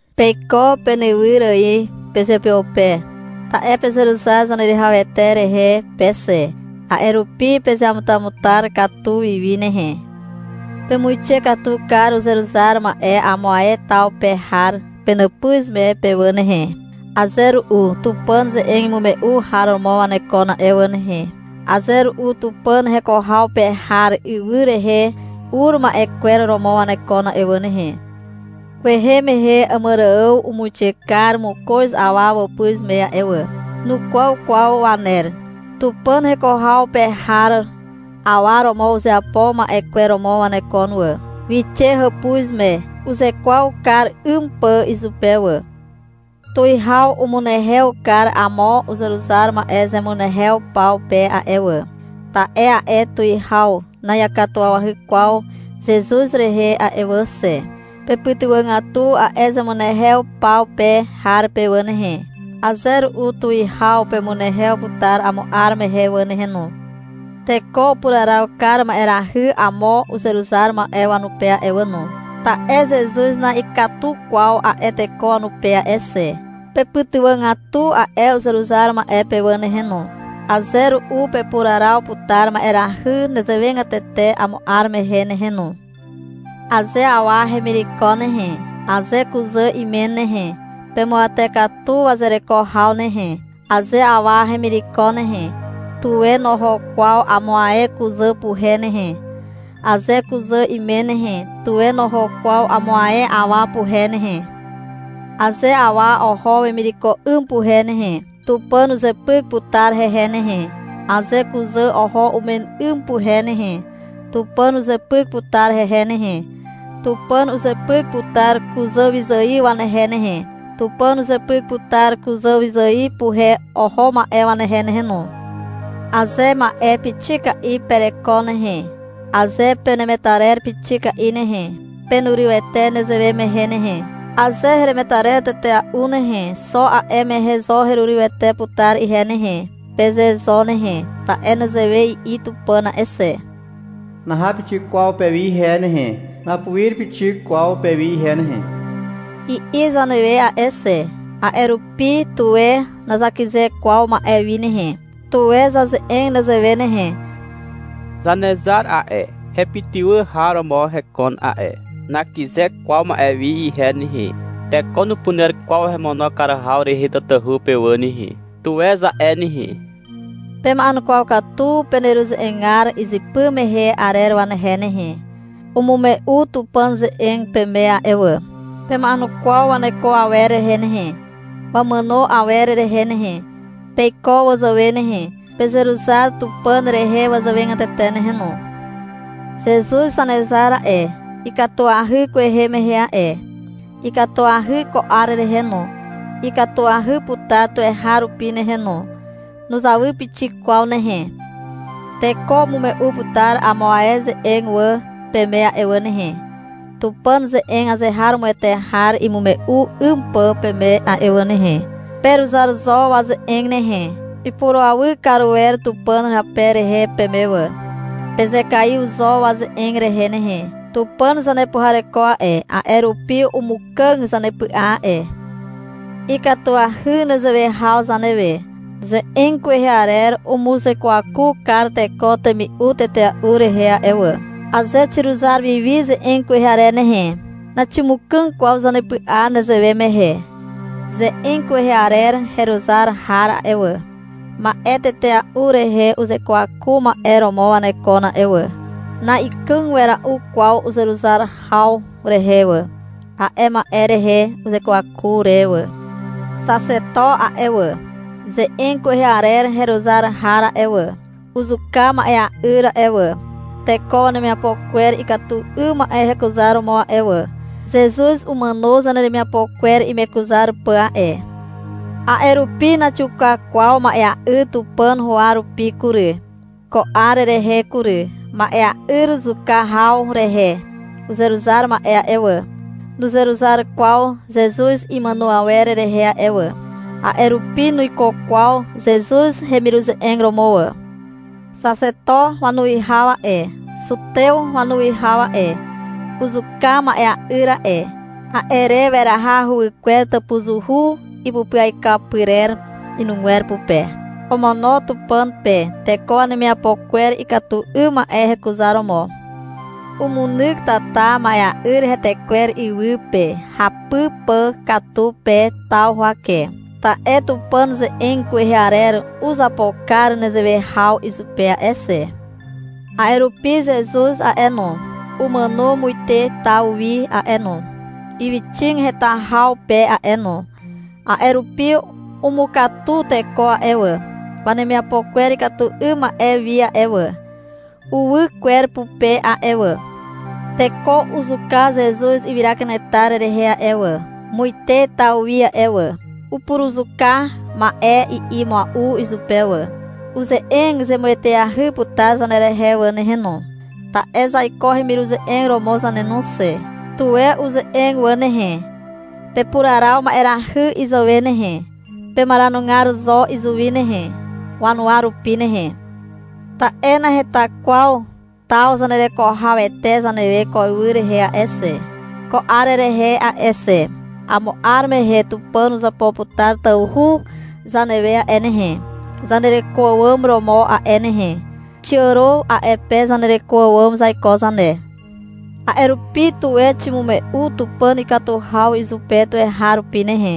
Peiko penywyr ài pezeupeupe, ta'e pezeruzar Zaneruwihawete rehe pe xe. A'e rupi pezeamutamutar katu wi wi nehe. Pemuixe katu kar uzeruzar ma'e amo ae taw pe har penàpuz me pe wà nehe. Aze ru'u Tupàn ze'eg imume'u har romo wanekon a'e wà nehe. (Aze ru'u Tupàn heko haw pe har ywy rehe ur ma'e kwer romo wanekon a'e wà nehe.) Kwehe mehe Àmàrààw umuixe kar mokoz awa wàpuz me a'e wà. Nukwaw kwaw waner. Tupàn heko haw pe har awa romo uzeapo ma'e kwer romo wanekon wà. Wixe hàpuz me uzekwaw kar 'ym pà izupe wà. Tuwihaw umunehew kar amo uzeruzar ma'e zemunehew paw pe a'e wà, ta'e a'e tuwihaw na'iakatuwawahy kwaw Zezuz rehe a'e wà xe. Pepytywàgatu a'e zemunehew paw pe har pe wà nehe. Aze ru'u tuwihaw pemunehew putar amo 'ar mehe wà nehe no. Teko upuraraw kar ma'erahy amo uzeruzar ma'e wanupe a'e wà no, ta'e Zezuz na'ikatu kwaw a'e teko wanupe a'e xe. Pepytywàgatu a'e uzeruzar ma'e pe wà nehe no. Aze ru'u pepuraraw putar ma'erahy nezewegatete amo 'ar mehe nehe no. Aze awa hemireko nehe, aze kuzà imen nehe, pemuawate katu wazereko haw nehe. Aze awa hemireko nehe, tuwe noho kwaw amo ae kuzà puhe nehe. Aze kuzà imen nehe, tuwe noho kwaw amo ae awa puhe nehe. Aze awa oho wemireko 'ym puhe nehe, Tupàn uzepyk putar hehe nehe. Aze kuzà oho umen 'ym puhe nehe, Tupàn uzepyk putar hehe nehe. Tupàn uzepyk putar kuzàwyzài wanehe nehe. Tupàn uzepyk putar kuzàwyzài puhe oho ma'e wanehe nehe no. Aze ma'e pixika'i ma'e pereko nehe, aze penemetarer pixika'i nehe, penurywete nezewe mehe nehe. — Aze heremetarer tetea'u nehe, xo a'e mehe zo herurywete putar ihe nehe, peze zo nehe. Ta'e nezewe i'i Tupàn a'e xe. — Naha pixik kwaw pewi ihe nehe. Napuir pixik kwaw pewi ihe nehe, i'i zanewe a'e xe. A'e rupi, tuwe nazakyze kwaw ma'e wi nehe. Tuwe zaze'eg nezewe nehe. — Zanezar a'e, hepytywà har romo hekon a'e. Nakyze kwaw ma'e wi ihe nehe. Teko nupuner kwaw hemono kar haw rehe tatahu pe wà nehe, tuwe za'e nehe. Pema'enukwaw katu peneruze'egar izypy mehe arer wanehe nehe. Umume'u Tupàn ze'eg peme a'e wà. Pema'enukwaw waneko awer rehe nehe, wamàno awer rehe nehe. Peiko wazàwe nehe, pezeruzar Tupàn rehe wazàwegatete nehe no. Zezuz Zanezar a'e, ikatuahy kwehe mehe a'e. Ikatuahy ko 'ar rehe no. Ikatuahy putar tuweharupi nehe no. Nuzawy pixik kwaw nehe. Teko umume'u putar amo ae ze'eg wà peme a'e wà nehe, Tupàn ze'eg azeharomoete har imume'u 'ym pà peme a'e wà nehe. Peruzar zo waze'eg nehe. Ipurawy kar wer Tupàn hape rehe peme wà. Pezekaiw zo waze'eg rehe nehe. Tupàn zanepuhareko a'e, a'e rupi umukàg zanepy'a a'e. Ikatuahy nezewe haw zanewe. Ze'eg kwehe arer umuzekwaku kar teko temi'u tetea'u rehe a'e wà. Aze xiruzar wi wi ze'eg kwehe arer nehe, naximukàg kwaw zanepy'a nezewe mehe. Ze'eg kwehe arer heruzar har a'e wà, ma'e tetea'u rehe uzekwaku ma'e romo wanekon a'e wà. Na'ikàg wera'u kwaw uzeruzar haw rehe wà, a'e ma'e rehe uzekwaku re wà. Xaxeto a'e wà, ze'eg kwehe arer heruzar har a'e wà, uzuka ma'ea'yr a'e wà, teko wanemiapo kwer ikatu 'ym ma'e hekuzaromo a'e wà. Zezuz umàno zaneremiapo kwer imekuzar pà a'e. A'e rupi naxiuka kwaw ma'ea'yr Tupàn huwa rupi kury. Ko 'ar rehe kury, ma'ea'yr zuka haw rehe uzeruzar ma'e a'e wà, nuzeruzar kwaw Zezuz imàno awer rehe a'e wà. A'e rupi nuiko kwaw Zezuz hemiruze'eg romo wà. Xaxeto wanuwihaw a'e, zutew wanuwihaw a'e, uzuka ma'ea'yr a'e. A'e re weraha huwykwer tàpuzuhu ipupyaikaw pyrer inugwer pupe. Omono Tupàn pe teko wanemiapo kwer ikatu 'ym ma'e hekuzaromo. Umunyk tata ma'ea'yr hetekwer iwy pe hapy pà katu pe taw huwake. Ta'e Tupàn ze'eg kwehe arer uzapo kar nezewe haw izupe a'e xe. A'e rupi Zezuz a'e no, umàno muite taw wi a'e no, ywyxig heta haw pe a'e no. A'e rupi umukatu teko a'e wà, wanemiapo kwer ikatu 'ym ma'e wi a'e wà, uwy kwer pupe a'e wà. Teko uzuka Zezuz ywyra kanetar rehe a'e wà, muite taw wi a'e wà. — Upuruzuka ma'e, i'i mua'u izupe wà. Uze'eg zemueteahy putar zanerehe wà nehe no, ta'e zaiko hemiruze'eg romo zane no xe. Tuwe uze'eg wà nehe. Pepuraraw ma'erahy izàwe nehe. Pemaranugar zo izuwi nehe, wanuwa rupi nehe. Ta'e naheta kwaw taw zanereko hawete zanewe ko ywy rehe a'e xe, ko 'ar rehe a'e xe. Amo 'ar mehe Tupàn uzapo putar tawhu zanewe a'e nehe, zanereko àwàm romo a'e nehe. Xiàro a'e pe zanereko àwàm zaiko zane. A'e rupi, tuwe ximume'u Tupàn ikatu haw izupe tuweharupi nehe,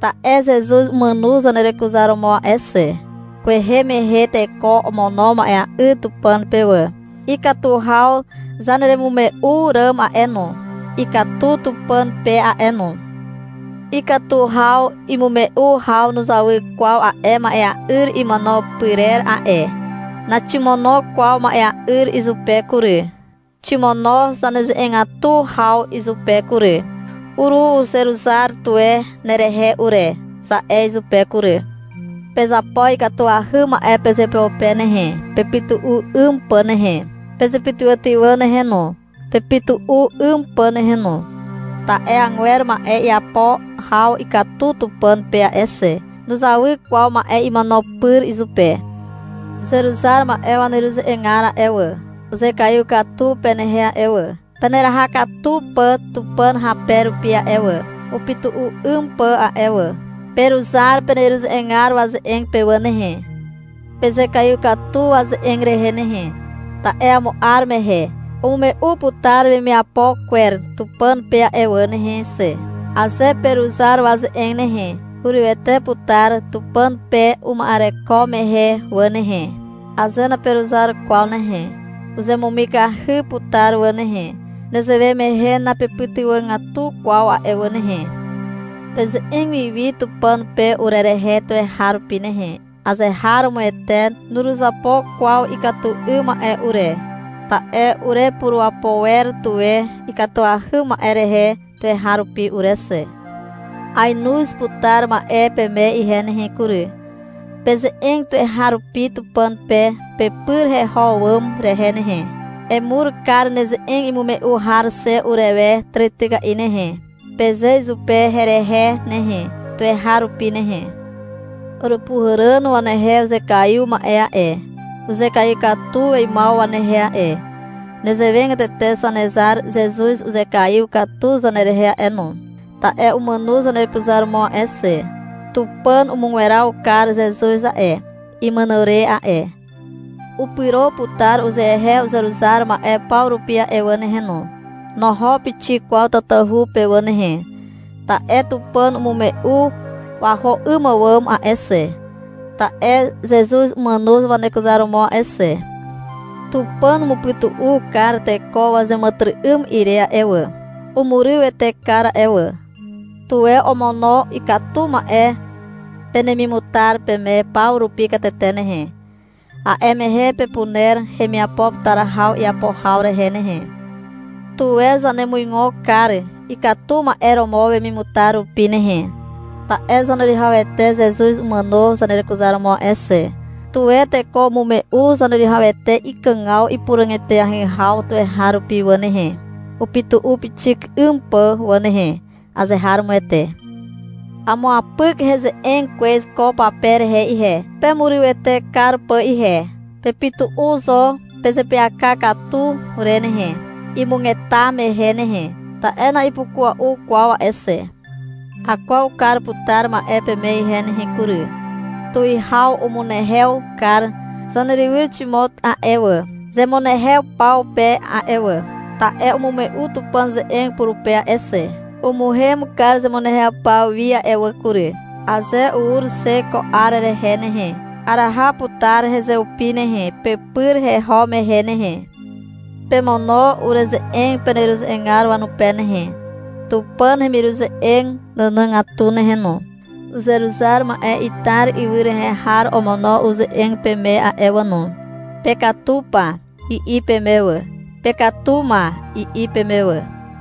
ta'e Zezuz umàno zanerekuzaromo a'e xe. Kwehe mehe teko omono ma'ea'yr Tupàn pe wà. Ikatu haw zaneremimume'u ràm a'e no, ikatu Tupàn pe a'e no. Ikatu haw imume'u haw nuzawy kwaw a'e ma'ea'yr imono pyrer a'e. Naximono kwaw ma'ea'yr izupe kury. Ximono zaneze'egatu haw izupe kury. — Uruzeruzar tuwe nerehe ure, za'e izupe kury. Pezapo ikatuahy ma'e pezeupeupe nehe, pepytu'u 'ym pà nehe. Pezepytywàtywà nehe no, pepytu'u 'ym pà nehe no. Ta'e agwer ma'e iapo haw ikatu Tupàn pe a'e xe. Nuzawy kwaw ma'e imono pyr izupe. Uzeruzar ma'e waneruze'egar a'e wà, uzekaiw katu penehe a'e wà, peneraha katu pà Tupàn hape rupi a'e wà, upytu'u 'ym pà a'e wà. Peruzar peneruze'egar waze'eg pe wà nehe. Pezekaiw katu waze'eg rehe nehe. Ta'e amo 'ar mehe umume'u putar wemiapo kwer Tupàn pe a'e wà nehe xe. Aze peruzar waze'eg nehe, hurywete putar Tupàn pe uma'ereko mehe wà nehe. Aze naperuzar kwaw nehe, uzemumikahy putar wà nehe. Nezewe mehe napepytywàgatu kwaw a'e wà nehe. Peze'eg wi wi Tupàn pe urerehe tuweharupi nehe. Azeharomoete nuruzapo kwaw ikatu 'ym ma'e ure. Ta'e urepurapo wer tuwe ikatuahy ma'e rehe tuweharupi ure xe. Aenoz putar ma'e peme ihe nehe kury. Peze'eg tuweharupi Tupàn pe pepyr heho àwàm rehe nehe. — Emur kar neze'eg imume'u har xe urewe tàrityka'i nehe, peze izupe herehe nehe, tuweharupi nehe. Àràpuhàràn wanehe uzekaiw ma'e a'e, uzekaiw katu weimaw wanehe a'e. Nezewegatete Zanezar Zezuz uzekaiw katu zanerehe a'e no, ta'e umàno zanerekuzaromo a'e xe. Tupàn umugweraw kar Zezuz a'e, imàno re a'e. Upyro putar uzehe uzeruzar ma'e paw rupi a'e wà nehe no. Noho pixik kwaw tatahu pe wà nehe, ta'e Tupàn umume'u waho 'ym àwàm a'e xe, ta'e Zezuz umàno wanekuzaromo a'e xe. Tupàn umupytu'u kar teko wazeàmàtyry'ym ire a'e wà. Umurywete kar a'e wà. Tuwe omono ikatu ma'e penemimutar peme paw rupi katete nehe. A'e mehe pepuner hemiapo putar haw iapo haw rehe nehe. Tuwe zanemuigo kar ikatu ma'e romo wemimutar rupi nehe, ta'e Zaneruwihawete Zezuz umàno zanerekuzaromo a'e xe. Tuwe teko umume'u Zaneruwihawete ikàgaw ipuràg eteahy haw tuweharupi wà nehe, upytu'u pixik 'ym pà wà nehe. Azeharomoete. Amuapyk heze'eg kwez ko pape rehe ihe, pemurywete kar pà ihe. Pepytu'u zo pezeapyaka katu re nehe, imugeta mehe nehe. Ta'e na'ipukua'u kwaw a'e xe. Akwaw kar putar ma'e peme ihe nehe kury. Tuwihaw umunehew kar zanerywyr Ximot a'e wà, zemunehew paw pe a'e wà, ta'e umume'u Tupàn ze'eg purupe a'e xe. Umuhem kar zemunehew paw wi a'e wà kury. Aze ur xe ko 'ar rehe nehe, araha putar hezeupi nehe, pepyr heho mehe nehe. Pemono ureze'eg peneruze'egar wanupe nehe, Tupàn hemiruze'eg nànàgatu nehe no. Uzeruzar ma'e Itar ywy rehe har omono uze'eg peme a'e wà no. — Pekatu pa, i'i peme wà. — Pekatu ma, i'i peme wà.